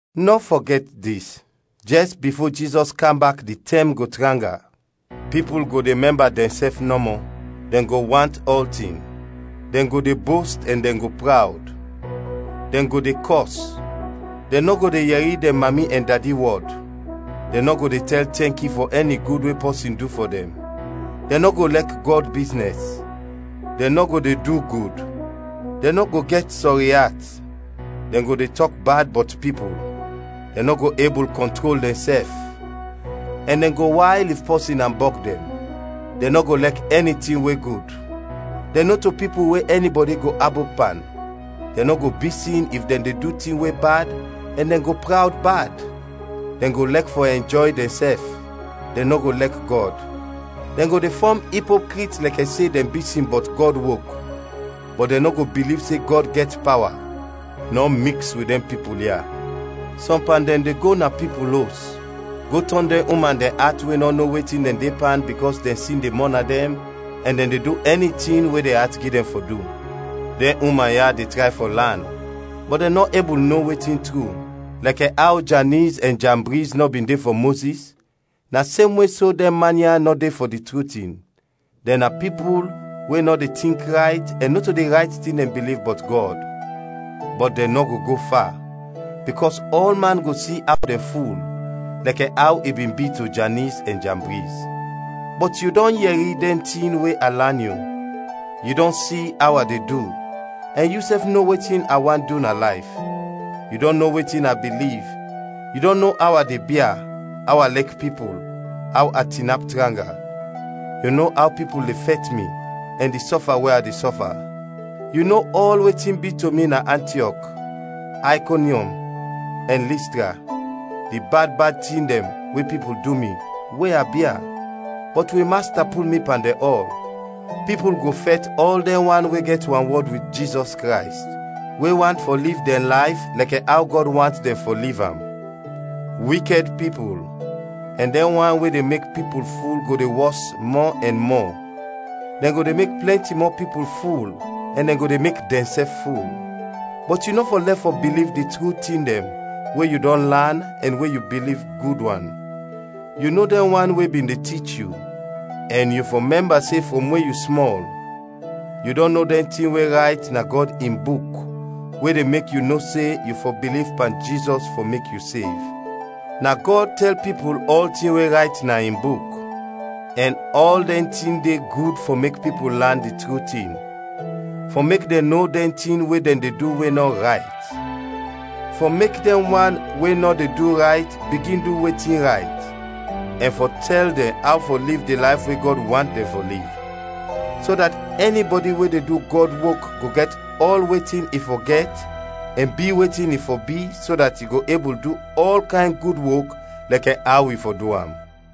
Nɔ fɔgɛt dis: Jɛs bifo Jizɔs kam bak di tɛm go tranga. Pipul go de mɛmba dɛnsɛf nɔmɔ, dɛn go want ɔltin, dɛn go de bost ɛn dɛn go prawd; dɛn go de kɔs, dɛn nɔ go de yɛri dɛn mami ɛn dadi wɔd, dɛn nɔ go de tɛl tɛnki fɔ ɛni gud we pɔsin du fɔ dɛn, dɛn nɔ go lɛk Gɔd biznɛs; dɛn nɔ go de du gud, dɛn nɔ go gɛt sɔri at, dɛn go de tɔk bad bɔt pipul, dɛn nɔ go ebul kɔntrol dɛnsɛf, ɛn dɛn go wayl if pɔsin ambɔg dɛn; dɛn nɔ go lɛk ɛni tin we gud; dɛn nɔto pipul we ɛnibɔdi go abop pan; dɛn nɔ go bisin if dɛn de du tin we bad ɛn dɛn go prawd bad; dɛn go lɛk fɔ ɛnjɔy dɛnsɛf, dɛn nɔ go lɛk Gɔd; dɛn go de fɔm ipokrit lɛkɛ se dɛn bisin bɔt Gɔd wok, bɔt dɛn nɔ go biliv se Gɔd gɛt pawa. Nɔ miks wit dɛn pipul ya. Sɔm pan dɛn de go na pipul os, go tɔn dɛn uman dɛn at we nɔ no wetin dɛn de pan bikɔs dɛn sin de mɔna dɛn ɛn dɛn de du ɛni tin we dɛn at gi dɛn fɔ du; dɛn uman ya de tray fɔ lan, bɔt dɛn nɔ ebul no wetin tru. Lɛkɛ aw Janiz ɛn Jambriz nɔ bin de fɔ Mozis, na semwe so, dɛn man ya nɔ de fɔ di tru tin dɛn na pipul we nɔ de tink rayt ɛn nɔto di rayt tin dɛn biliv bɔt Gɔd. Bɔt dɛn nɔ go go fa, bikɔs ɔlman go si aw dɛn ful, lɛkɛ aw i bin bi to Janiz ɛn Jambriz. Bɔt yu dɔn yɛri dɛn tin we a lan yu, yu dɔn si aw a de du, ɛn yusɛf no wetin a want du na layf; yu dɔn no wetin a biliv, yu dɔn no aw a de bia, aw a lɛk pipul, aw a tinap tranga. Yu no aw pipul de fɛt mi, ɛn di sɔfa we a de sɔfa. Yu no ɔl wetin bin bi to mi na Antiɔk, Aykonyɔm ɛn Listra, di bad bad tin dɛn we pipul du mi, we a bia! Bɔt wi Masta pul mi pan dɛn ɔl. Pipul go fɛt ɔl dɛn wan we gɛt wanwɔd wit Jizɔs Krays, we want fɔ liv dɛn layf lɛkɛ aw Gɔd want dɛn fɔ liv am. Wikɛd pipul ɛn dɛn wan we de mek pipul ful go de wɔs mɔ ɛn mɔ, dɛn go de mek plɛnti mɔ pipul ful ɛn dɛn go de mek dɛnsɛf ful. Bɔt yu nɔ fɔ lɛf fɔ biliv di tru tin dɛn we yu dɔn lan ɛn we yu biliv gud wan. Yu no dɛn wan we bin de tich yu, ɛn yu fɔ mɛmba se frɔm we yu smɔl, yu dɔn no dɛn tin we rayt na Gɔd in Buk we de mek yu no se yu fɔ biliv pan Jizɔs fɔ mek yu sev. Na Gɔd tɛl pipul ɔltin we rayt na in Buk, ɛn ɔl dɛn tin de gud fɔ mek pipul lan di tru tin, fɔ mek dɛn no dɛn tin we dɛn de du we nɔ rayt, fɔ mek dɛn wan we nɔ de du rayt bigin du wetin rayt, ɛn fɔ tɛl dɛn aw fɔ liv di layf we Gɔd want dɛn fɔ liv, so dat ɛnibɔdi we de du Gɔd wok go gɛt ɔl wetin i fɔ gɛt ɛn bi wetin i fɔ bi so dat i go ebul du ɔl kayn gud wok lɛkɛ aw i fɔ du am.